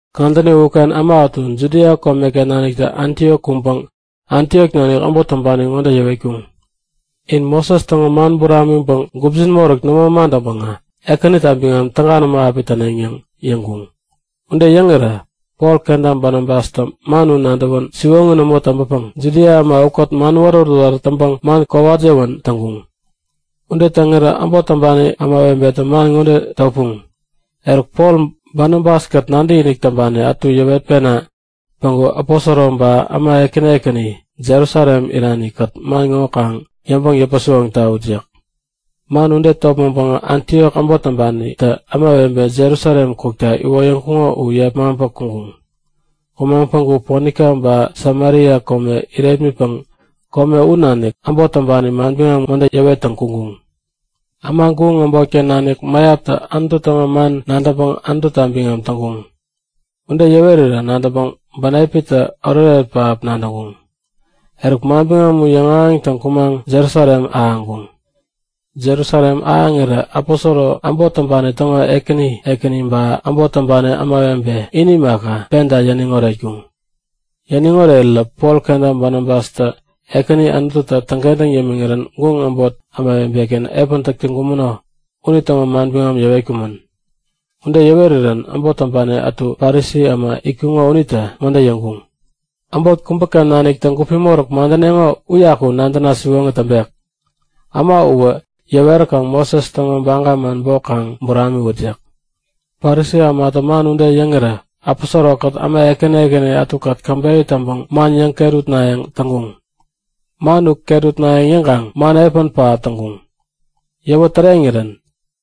Kadäni uken äma ätu Judia komeken naniktä Antiok kuŋpäŋ Antiok nanik äbot täŋpani ŋode yäwetkuŋ; In Moses täŋo man buramiŋpäŋ gupjin moräk nämo madäŋpäŋä Ekänita biŋam täga nämo api täneŋ yäŋ yäŋkuŋ. Ude yäŋirä Pol kenta Banabastä man u nadäwän siwoŋi nämo täŋpäpäŋ Judia äma ukät man wärät-wärät täŋpäŋ man kowat yäwän täŋkuŋ. Ude täŋirä äbot täŋpani ämawebetä man ŋode topuŋ; Eruk, Pol Banabas-kät nadäkinik täŋpani ätu yäwetpena päŋku aposoro ba äma ekäni ekäni Jerusalem irani-kät man ŋo kaŋ yäŋpäŋ yäpä-siwoŋ tawut yäk. Man ude topmäŋpäŋä Antiok äbot täŋpanitä ämawebe Jerusalem kukta iwoyäŋkuŋo u yepmaŋpä kuŋkuŋ. Kumaŋ päŋku Ponika ba Samaria kome irepmitpäŋ kome u nanik äbot täŋpani manbiŋam ŋode yäwettäŋ kuŋkuŋ; Äma guŋ äbotken nanik mäyaptä Anutu täŋo man nadäŋpäŋ Anututa biŋam täŋkuŋ. Ude yäwerirä nadäŋpäŋ bänepitä oretoret pähap nadäŋkuŋ. Eruk manbiŋam u yäŋahäŋtäŋ kumaŋ Jerusalem ahäŋkuŋ. Jerusalem ahäŋirä aposoro, äbot täŋpani täŋo ekäni ekäni ba äbot täŋpani ämawebe ini imaka, penta yäniŋ oretkuŋ. Yäniŋ orerirä Pol kenta Banabastä Ekäni Anututä täŋkentäŋ yämiŋirän guŋ äbot ämawebe-ken epän täŋkumäno unitäŋo manbiŋam yäwetkumän. Ude yäwerirän äbot täŋpani ätu Parisi äma itkuŋo unitä ŋode yäŋkuŋ; Äbot kubäken naniktä gupi moräk madäneŋo uyaku nadäna siwoŋi täŋpek. Äma uwä yäweräkaŋ Moses täŋo baga man bok kaŋ buramiwut yäk. Parisi ämatä man ude yäŋirä aposoro-kät äma ekäni ätukät käbeyä täŋpäŋ man yäŋ-ket utnayäŋ täŋkuŋ. Man u ket utnayäŋ yäŋkaŋ man epän pähap täŋkuŋ. Yäwä täreŋirän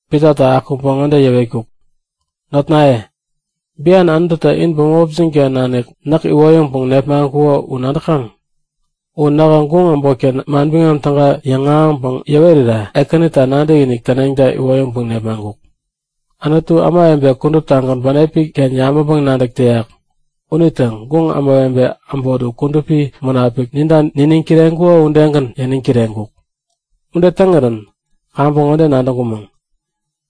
Pitatä akuŋpäŋ ŋode yäwetkuk; Notnaye, bian Anututä in bämopjin-ken nanik näk iwoyäŋpäŋ nepmaŋkuko u nadäkaŋ. U nähä guŋ äbotken Manbiŋam Täga yäŋahäŋpäŋ yäwerira Ekänita nadäkinik täneŋta iwoyäŋpäŋ nepmaŋkuk. Anutu, ämawebe kuduptagän bänepi-ken yabäŋpäŋ-nadäk täyak unitä guŋ ämawebe äbot u Kudupi Munapik ninta niniŋ kireŋkuko udegän yäniŋ kireŋkuk. Ude täŋirän kaŋpäŋ ŋode nadäŋkumäŋ;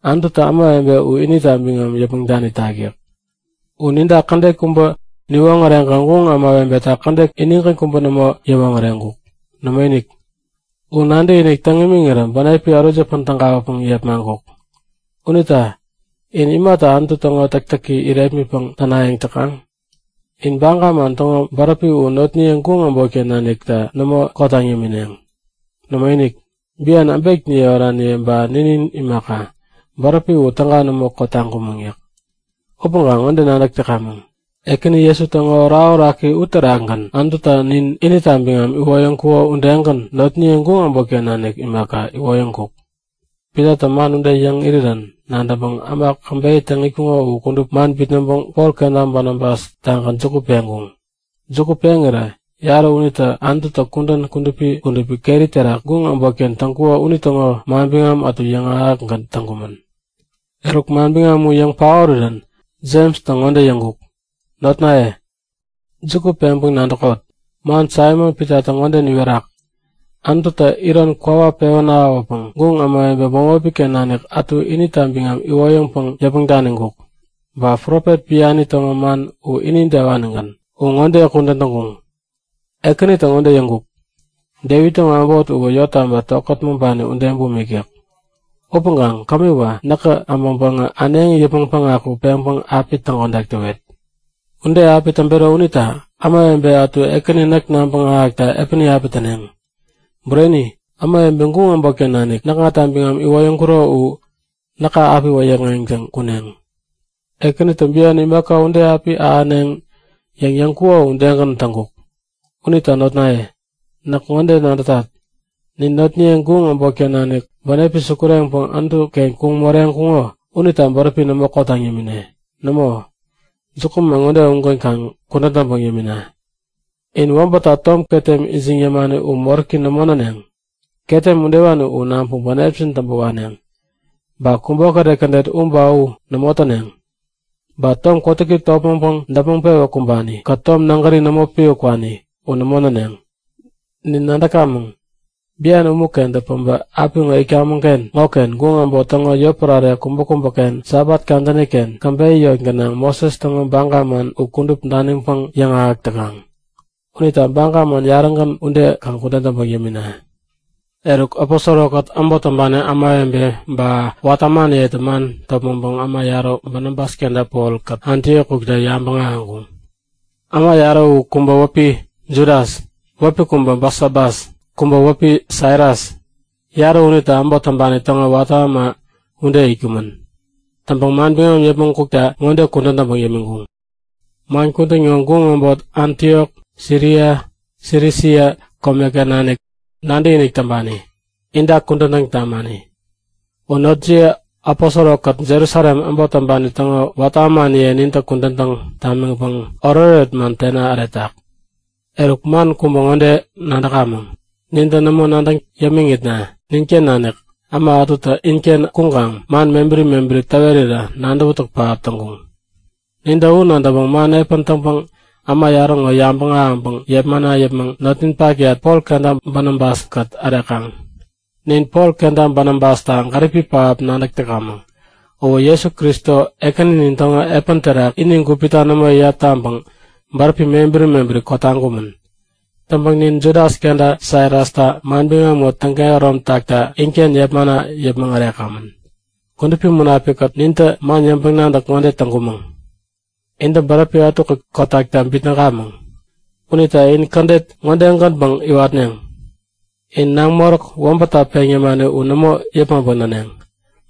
Anututä ämawebe u inita biŋam yäpmäŋ danitak yäk. U ninta kädet kubä niwoŋäreŋkaŋ guŋ ämawebeta kädet inigän kubä nämo yäwoŋäreŋkuk. Nämoinik! U nadäkinik täŋ imiŋirä bänepi ärut yäpän tägawäpäŋ yepmaŋkuk. Unita in imata Anutu täŋo täktäki irepmitpäŋ tänayäŋ täkaŋ? In baga man täŋo bäräpi u notniye guŋ äbotken nanikta nämo kotaŋ yämineŋ. Nämoinik, bian äbekniye oraniye ba ninin imaka, bäräpi u täga nämo kotaŋkumäŋ yäk. Upäŋkaŋ ŋode nadäk täkamäŋ; Ekäni Jesu täŋo orakoraki uterakgän Anututä nin inita biŋam iwoyäŋkuko udegän notniye guŋ äbotken nanik imaka, iwoyäŋkuk. Pitatä man ude yäŋ irirän nadäŋpäŋ äma käbeyä täŋ itkuŋo u kudup man bitnäŋpäŋ Pol kenta Banabas-tagän juku peŋkuŋ. Juku peŋirä yarä unitä Anututä kudän kudupi kudupi keri terak guŋ äbotken täŋkuko unitäŋo manbiŋam ätu yäŋahäkgän täŋkumän. Eruk, manbiŋam u yäŋ paorirän Jemstä ŋode yäŋkuk; Notnaye, juku peŋpäŋ nadäkot! Man Saimon-Pitatä ŋode niwerak; Anututä ironi kwawa pewän ahäwäpäŋ guŋ ämawebe bämopi-ken nanik ätu inita biŋam iwoyäŋpäŋ yäpmäŋ daniŋkuk. Ba profet biani täŋo man u inidewanigän. U ŋode kudän täŋkuŋ; Ekänitä ŋode yäŋkuk; Devit täŋo äbot uwä yottaba tokät maŋpani ude bumik yäk. Upäŋkaŋ kämiwä, näkä äbäŋpäŋä äneŋi yäpmäŋ päŋaku peŋpäŋ api täŋkodak täwet. Ude api täŋpero unita ämawebe ätu Ekäni näk nabäŋ ahäkta epäni api täneŋ. Bureni, ämawebe guŋ äbotken nanik näkŋata biŋam iwoyäŋkuro u näka api wäyäkŋeŋtäŋ kuneŋ. Ekänitä bian imaka ude api ahäneŋ yäŋ yäŋkuko udegän täŋkuk. Unita notnaye, näk ŋode nadätat. Nin notniye guŋ äbotken nanik bänepi sukureŋpäŋ Anutu-ken kuŋ moreŋkuŋo unita bäräpi nämo kotaŋ yämine. Nämo, jukuman ŋode ugänpäŋ kaŋ kudän täŋpäŋ yämina; In wäbätta tom ketem ijiŋ yämani u moräki nämo näneŋ. Ketem udewani u naŋpäŋ bänepjin täŋpä waneŋ. Ba kubokäret kädet u ba u nämo täneŋ. Ba tom kotäki topmäŋpäŋ däpmäŋ-pewä kumbani-kät tom nägäri nämo piwä kwani u nämo näneŋ. Nin nadäkamäŋ, bian umu-kentä päbä apiŋo itkamäŋ-ken ŋoken guŋ äbot täŋo yotpärare kubäkubäken Sabat kadäni-ken käbeyä yot gänaŋ Moses täŋo baga man u kudup daniŋpäŋ yäŋahäk täkaŋ. Unita Baga man yarägän ude kaŋ kudän täŋpäŋ yämina. Eruk, aposoro-kät äbot täŋpani ämawebe ba watä ämaniyetä man topmäŋpäŋ äma yarä Banabas kenta Polkät Antiok kukta yabäŋ ahäŋkuŋ. Äma yarä u kubä wäpi Judas wäpi kubä Basabas, kubä wäpi Silas. Yarä unitä äbot täŋpani täŋo watä äma ude itkumän. Täŋpäŋ manbiŋam yäpmäŋ kukta ŋode kudän täŋpäŋ yämiŋkuŋ; Man kudän ŋo guŋ äbot Antiok, Siria, Silisia komeken nanik nadäkinik täŋpani, inta kudän täŋ tamani. U notjiye aposoro-kät Jerusalem äbot täŋpani täŋo watä ämaniye nintä kudän täŋ tamiŋpäŋ oretoret man tena äretak. Eruk man kubä ŋode nadämäŋ; Nintä nämo nadäŋ yämiŋitna ninken nanik äma ätutä inken kuŋkaŋ man mebäri mebäri täwerirä nadäwätäk pähap täŋkuŋ. Nintä u nadäŋpäŋ man epän täŋpäŋ äma yarä ŋo yabäŋ ahäŋpäŋ yepmana yäpmäŋ notninpakyat Pol kenta Banabas-kät ärekaŋ. Nin Pol kenta Banabasta gäripi pähap nadäk täkamäŋ. Uwä Jesu Kristo Ekäninin täŋo epän terak ini gupita nämo iyap taŋpäŋ bäräpi mebäri mebäri kotaŋkumän. Täŋpäŋ nin Judas kenta Silastä manbiŋam ŋo täŋkehärom takta, inken yepmana yäpmäŋ ärekamän. Kudupi Munapik-kät nintä man yäŋpäŋ-nadäk ŋode täŋkumäŋ; Intä bäräpi ätukät kotakta bitnäkamäŋ. Unita in kädet ŋode-gänpäŋ iwatneŋ; In naŋ moräk wäbätta peŋ yämani u nämo yäpmäŋpäŋ näneŋ.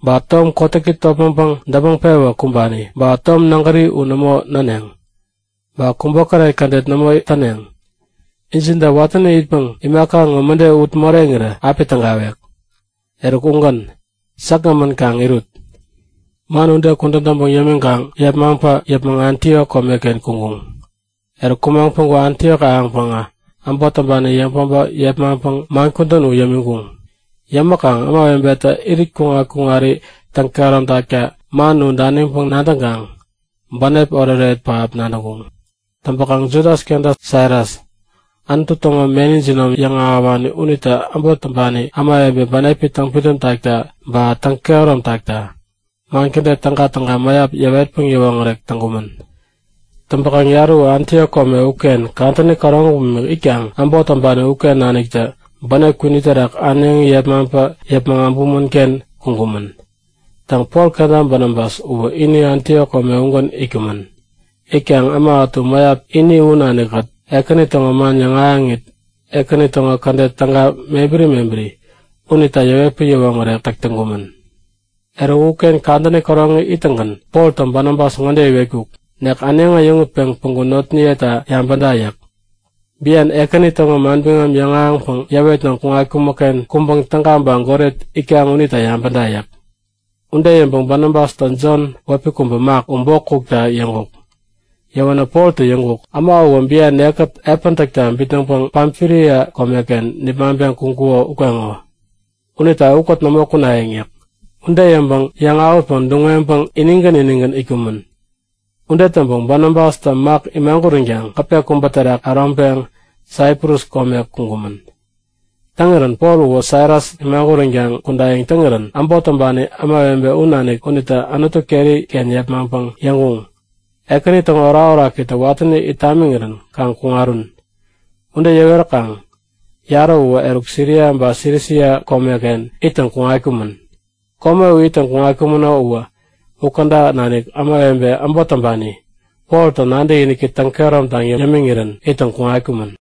Ba tom kotäki topmäŋpäŋ däpmäŋ-pewä kumbani ba tom nägäri u nämo näneŋ. Ba kubokäret kädet nämo täneŋ. Injinta watäni itpäŋ imaka ŋo mäde ut moreŋirä api tägawek. Eruk, ugän. Säkgämän kaŋ irut. Man ude kudän täŋpäŋ yämiŋkaŋ yepmaŋpä yäpmäŋ Antiok komeken kuŋkuŋ. Eruk kumaŋ päŋku Antiok ahäŋpäŋä äbot täŋpani yäŋpäbä yepmaŋpäŋ man kudän u yämiŋkuŋ. Yämäkaŋ ämawebetä irit kuŋat-kuŋari täŋ-kehäromtak man u daniŋpäŋ nadäŋkaŋ bänep oretoret pähap nadäŋkuŋ. Täŋpäkaŋ Judas kenta Silas u Anutu täŋo meni jinom yäŋahäwani unita äbot täŋpani ämawebe bänepi täŋpidäm takta ba täŋkehärom takta man kädet tägatäga mäyap yäwetpäŋ yäwoŋärek täŋkumän. Täŋpäkaŋ yarä u Antiok kome uken kadäni käroŋi bumik itkaŋ äbot täŋpani uken naniktä bänep kwini terak äneŋi yepmaŋpä yäpmäŋ äbumän-ken kuŋkumän. Täŋ, Pol kenta Banabas uwä ini Antiok kome ugän itkumän. Itkaŋ äma ätu mäyap ini u nanikkät Ekäni täŋo man yäŋahäŋit, Ekäni täŋo kädet täga mebäri mebäri unita yäwetpäŋ yäwoŋärek täk täŋkumän. Eruk uken kadäni käroŋi ittäŋgän Poltä Banabas ŋode iwetkuk; Nek äneŋi äyäŋutpeŋ päŋku notniyeta yabäda yäk. Bian Ekäni täŋo manbiŋam yäŋahäŋpäŋ yäwettäŋ kuŋatkumäk-ken kuŋpäŋ täga ba goret itkaŋ unita yabäda yäk. Ude yäŋpäŋ Banabastä Jon wäpi kubä Mak u bok kukta yäŋkuk. Yäwänä Poltä yäŋkuk; Äma uwä bian nekkät epän täkta bitnäŋpäŋ Pamfilia komeken nipmaŋpeŋ kuŋkuko ukeŋo. Unita ukät nämo kunayäŋ yäk. Ude yäŋpäŋ yäŋ-awätpäŋ duŋ-weŋpäŋ inigän inigän itkumän. Ude täŋpäŋ Banabastä Mak imaguränkaŋ gäpe kubä terak äroŋpeŋ Saiprus kome kuŋkumän. Täŋirän Pol uwä Silas imaguränkaŋ kudayäŋ täŋirän äbot täŋpani ämawebe u nanik unitä Anutu keri-ken yepmaŋpäŋ yäŋkuŋ; Ekäni täŋo orakorakitä watäni it tamiŋirän kaŋ kuŋarun. Ude yäweräkaŋ yarä uwä eruk Siria ba Silisia komeken ittäŋ kuŋatkumän. Kome u ittäŋ kuŋatkumäno uwä, u käda nanik ämawebe äbot täŋpani Poltä nadäkiniki täŋkehärom taŋ yämiŋirän ittäŋ kuŋatkumän.